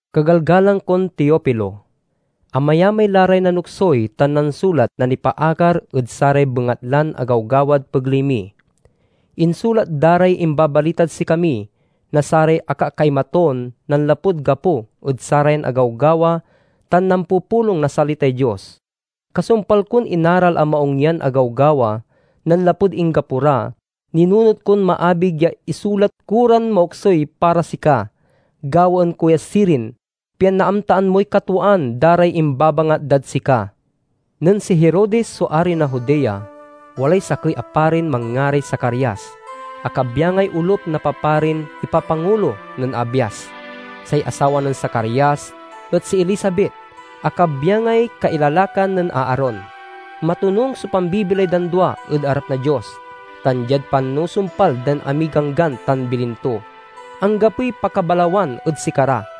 Kagalgalang kon Teofilo: Amayamay la ray nanoksuy tan nansulat na nipaakar ed saray bengatlan agawgawad pegley mi. Insulat da ray imbabalitad sikami na saray akakkaimatun nanlapud gapo ed sarayan agawgawa tan nampupulong na salitay Dios. Kasumpal kon inaral a maung yan agawgawa nanlapud inggapo ra, ninunot kon maabig ya isulat ko ran maoksuy para sika. Gawaen ko ya sirin, pian naamtaan moy katwaan da ray imbabangat dad sika. Nen si Herodes so ari na Judea, walay sakey a parin manngaray Zacarias, a kabyangay olup na paparin ipapangulo nen Abias. Say asawa nen Zacarias et si Elizabet, a kabyangay kailalakan nen Aaron. Matonung so pambibilay dan dua ed arap na Dios, tan diad panusumpal dan amiy ganggan tan bilin to, anggapoy pakabalawan ed sikara.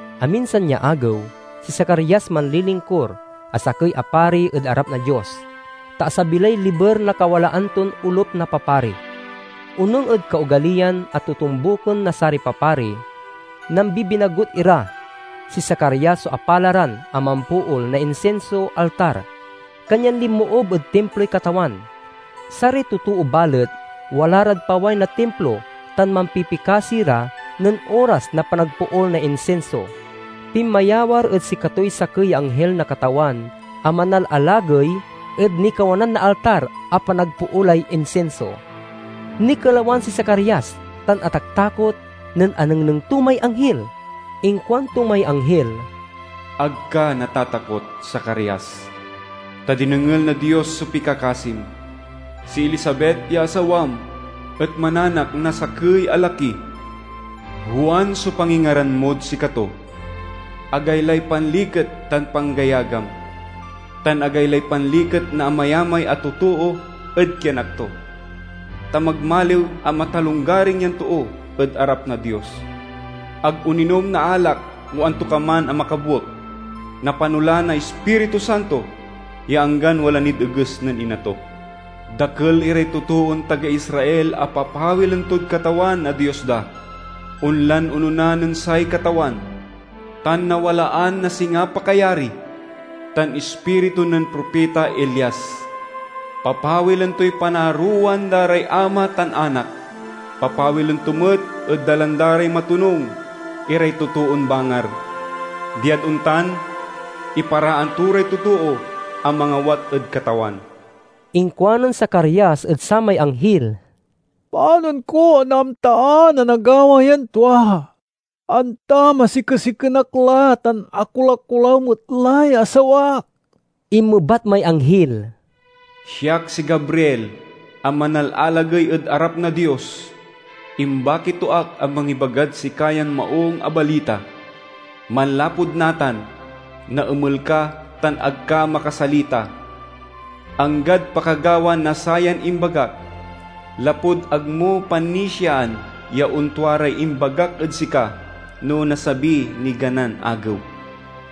Aminsan ya agew, si Zacarias manlilingkur a sakey a pari ed arap na Dios, ta asabi lay liber na kawalaan ton olup na papari. Onung ed kaogaliyan a totombuken na saray papari, nambibinagut ira. Si Zacarias so apalaran a mampool na insinso altar, kanyan linmoob ed Timploy Katawan. Saray totoo balet, wala rad paway na Timplo tan mampipikasi ra nen oras na panagpool na insinso. Pinmayawar ed sikatoy sakey ya anghil na Katawan a manalalagey ed nikawanan na altar a panagpoolay insinso. Nikelawan si Zacarias tan ataktakot nen anengneng to may anghil. Inkuanto may anghil, "Ag ka natatakot, Zacarias, ta dinengel na Dios so pikakasim! Si Elizabet ya asawam et mananak na sakey a laki. Juan so pangingaran mod sikato. Agaylay panliket tan panggayagam, tan agaylay panliket na amayamay a totoo ed kianak to! Ta magmaliw a matalonggaring yan too ed arap na Dios. Ag oninom na alak o antokaman a makabuek. Napano la na Ispiritu Santo ya anggan wala nid eges nen ina to. Dakel iray totoon taga Israel a papawilen tod Katawan a Dios da. Onlan onona nen say Katawan, tan nawalan na singa pakayari tan ispiritu nen propita Elias. Papawilen toy panaarowan da ray ama tan anak. Papawilen to met ed dalan da ray matonung iray totoon bangar. Diad ontan, iparaan to ray totoo a mangawat ed Katawan." Inkuanen Zacarias ed samay anghil, "Panon ko a naamtaan a nagawa yan tua, anta masikesiken ak la tan akolakolaw met lay asawak?" Inmebat may anghil, "Siak si Gabriel a manalalagey ed arap na Dios. Imbaki to ak a mangibagad sika yan maung a salita. Manlapud natan naemel ka tan ag ka makasalita, anggad pakagawa na sayan imbagak, lapud ag mo panisiaan ya ontua ray imbagak ed sika no nasabiy niganan agew."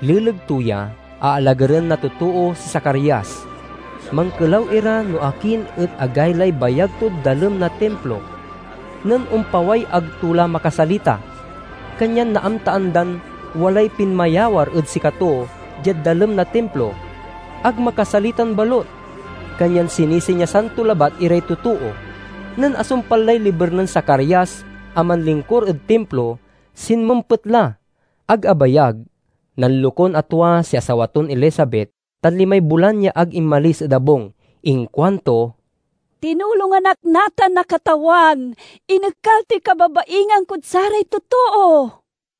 Leleg to ya, aalagaren na totoo si Zacarias. Mankelaw ira no akin et agaylay bayag tod dalem na Timplo. Nen ompaway ag to la makasalita, kanyan naamtaan dan walay pinmayawar ed sikato diad dalem na Timplo. Ag makasalitan balut, kanyan sinisinyasan to labat iray totoo. Nen asumpal lay liber nen Zacarias a manlingkur ed Timplo, sinmempet la. Ag abayag, nanlokun a tua si asawa ton Elizabet tan limay bulan ya ag inmalis ed abung. Inkuanto, "Tinulongan ak natan na Katawan. Inekal toy kababaingan kod saray totoo!"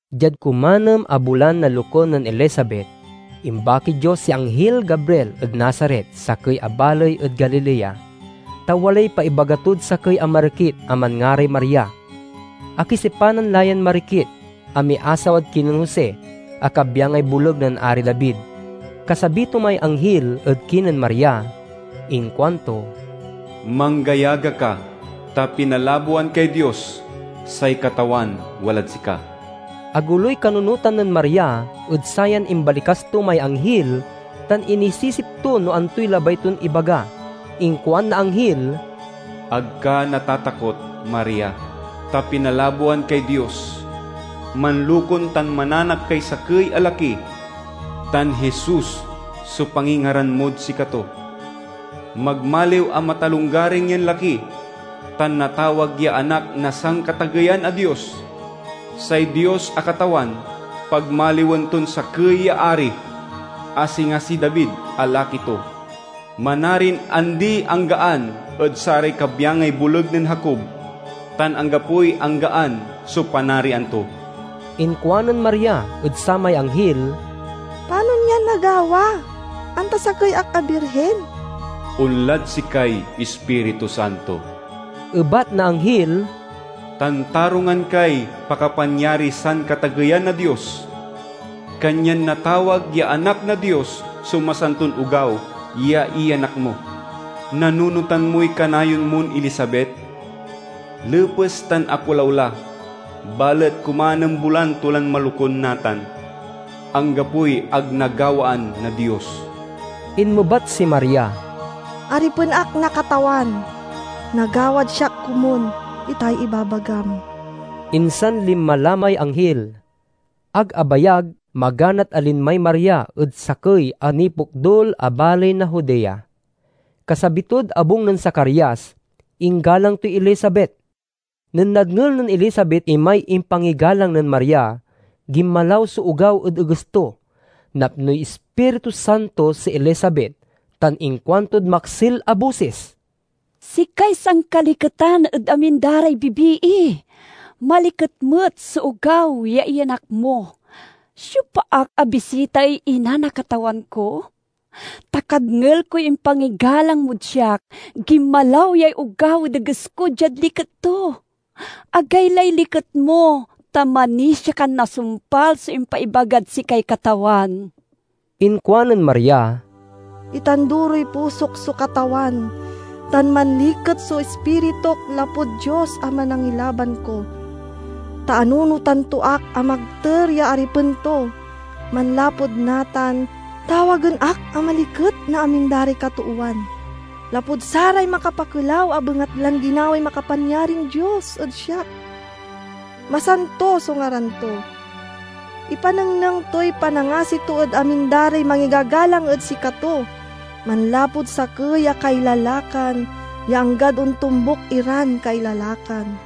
Diad kumanem a bulan na lokun nen Elizabet, imbakiy Dios si anghil Gabriel ed Nazaret, sakey a baley ed Galilea, ta walay paibaga tod sakey a marikit a manngaray Maria. Akisipanan la yan marikit a miasawad kinen Jose a kabyangay boleg nen Ari David. Kasabi to may anghil ed kinen Maria inkuanto, "Manggayaga ka, ta pinalaboan kay Dios! Say Katawan walad sika!" Agoloy kanunotan nen Maria ed sayan imbalikas to may anghil tan inisisip to no antoy labay ton ibaga. Inkuan na anghil, "Ag ka natatakot, Maria, ta pinalaboan kay Dios. Manlokun tan mananak kay sakey a laki, tan Jesus so pangingaran mod sikato. Magmaliw a matalonggaring yan laki tan natawag ya Anak na Sankatageyan a Dios. Say Dios a Katawan pagmaliwen ton sakey ya ari, a singa si David a laki ton. Manarin andi-anggaan ed saray kabyangay boleg nen Jacob, tan anggapoy anggaan so panarian to!" Inkuanen Maria ed samay anghil, "Panon yan nagawa, anta sakey ak a birhin?" "Onlad sikay Ispiritu Santo," ebat na anghil, "tan tarungan kay pakapanyariy Sankatageyan a Dios. Kanyan natawag ya Anak na Dios so masanton ogaw ya iyanak mo. Nanunotan moy kanayon mon Elizabet? Lepes tan akolaw la, balet kumanem bulan to lan malokun natan. Anggapoy ag nagawaan na Dios." Inmebat si Maria, "Aripen ak na Katawan. Nagawad siak komun itay ibabagam." Insan linma la may anghil. Ag abayag, maganat a linmay Maria ed sakey a nipokdul a baley na Judea. Kasabi tod abung nen Zacarias, inggalang toy Elizabet. Nen nadngel nen Elizabet imay impangigalang nen Maria, ginmalaw so ogaw ed eges to. Napnoy Ispiritu Santo si Elizabet tan inkuantod maksil a bosis, "Sikay sankaliketan ed amin da ray bibii! Maliket met so ogaw ya iyanak mo! Siopa ak a bisitaey ina na Katawan ko? Ta kadngel koy impangigalang mod siak, ginmalaw yay ogaw ed eges ko diad liket to. Agaylay liket mo, ta manisia kan nasumpal so impaibagad sikay Katawan!" Inkuanen Maria: "Itanduroy pusok so Katawan, tan manliket so ispirituk lapud Dios a Manangilaban ko, ta anunotan to ak a magter ya aripen to! Manlapud natan, tawagen ak a maliket na amin da ray katoowan, lapud saray makapakelaw a bengatlan ginaway Makapanyarin Dios ed siak. Masanto so ngaran to: ipanengneng toy panangasi to ed amin da ray mangigagalang ed sikato, manlapud sakey a kailalakan ya anggad ontombuk iran kailalakan.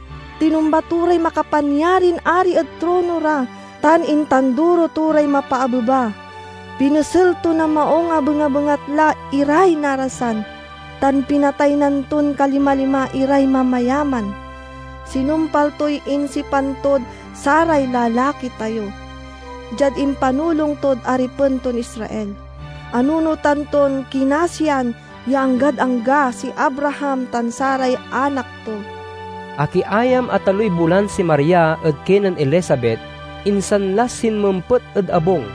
Tinumba to ray makapanyarin ari ed trono ra, tan intanduro to ray mapaabeba. Pinesel to na maung a bengabengatla iray narasan, tan pinataynan ton kalima-lima iray mamayaman. Sinumpal toy insipan tod saray lalaki tayo, diad impanulong tod aripen ton Israel; anunotan ton kinasian ya anggad angga si Abraham tan saray anak to!" Akiayam a taloy bulan si Maria ed kinen Elizabet, insan la sinmempet ed abung.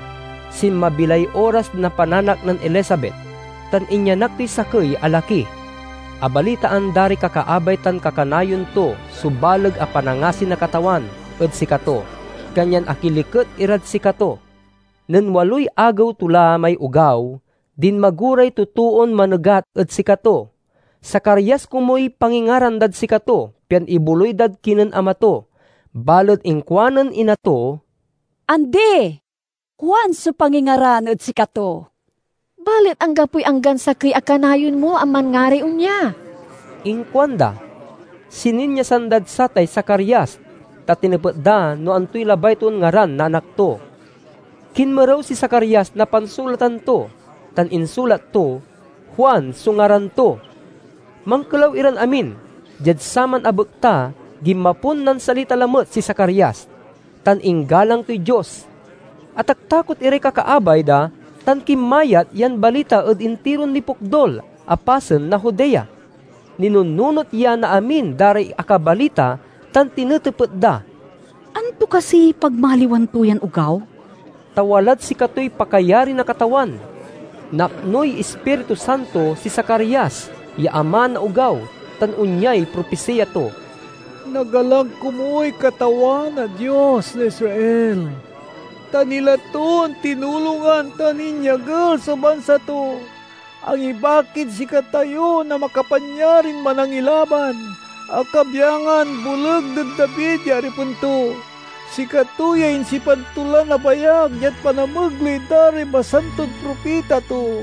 Sinmabi lay oras na pananak nen Elizabet, tan inyanak toy sakey a laki. Abalitaan da ray kakaabay tan kakanayon to so baleg a panangasi na Katawan ed sikato, kanyan akiliket irad sikato. Nen waloy agew to la may ogaw, dinmago ray totoon manegat ed sikato. Zacarias komuy pangingaran dad sikato pian iboloy dad kinen ama to, balet inkuanen ina to, "Andi! Juan so pangingaran ed sikato." "Balet anggapoy anggan sakey a kanayon mo a manngaray onya!" inkuanda. Sininyasan dad satay Zacarias, ta tinepet da no antoy labay ton ngaran na anak to. Kinmerew si Zacarias na pansulatan to, tan insulat to: "Juan so ngaran to!" Mankelaw iran amin! Diad saman a bekta ginmapon nansalita lamet si Zacarias, tan inggalang toy Dios. Ataktakot iray kakaabay da tan kinmayat yan balita ed intiron nipokdul a pasen na Judea. Ninunnunot ya na amin da ray akabalita tan tinetepet da, "Anto kasiy pagmaliwan to yan ogaw?" Ta walad sikatoy pakayari na Katawan. Napnoy Ispiritu Santo si Zacarias ya ama na ogaw tan onyay propisiya to: "Nagalang komuy Katawan a Dios na Israel! Ta nila ton tinulongan tan inyagel so bansa to. Angibakid sikatayo na makapanyarin Manangilaban, a kabyangan boleg nen David ya aripen to. Sikato yay insipan to lan abayag diad panamegley da ray masanton propita to.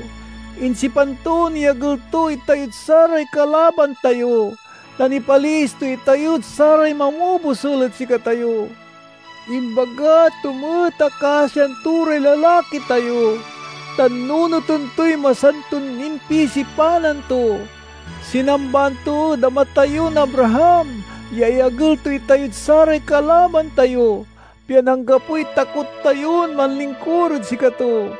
Insipan ton iyagel to itayod saray kalaban tayo, tan ipaliis to itayod saray mamobosul ed sikatayo. Imbaga to met a kasian to ray lalaki tayo, tan nunoten toy masanton impisipanan to. Sinambaan to ed ama tayon Abraham ya iyagel to itayod saray kalaban tayo, pian anggapoy takot tayon manlingkur ed sikato.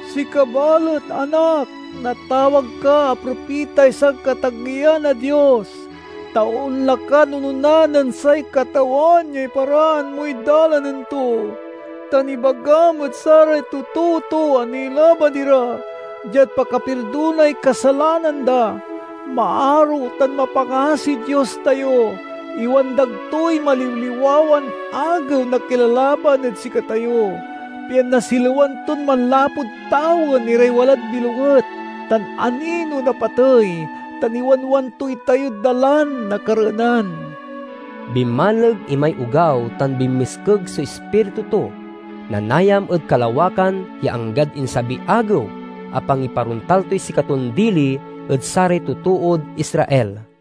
"Sika balet, anak, natawag ka a propitay Sankatageyan a Dios. Ta onla kan onona nen say Katawan ya iparaan moy dalanen to; tan ibagam ed saray totoo to a nilaban ira, diad pakapirdonay kasalanan da. Maaro tan mapangasiy Dios tayo. Iwandag toy maliwliwawan agew na kilalaban ed sikatayo, pian nasilewan ton manlapud tawen iray walad bilonget tan anino na patey, tan iwanwan to itayod dalan na kareenan." Binmaleg imay ogaw tan binmiskeg so ispiritu to. Nanayam ed kalawakan ya anggad insabiy agew a pangiparontal toy sikaton dili ed saray totood Israel.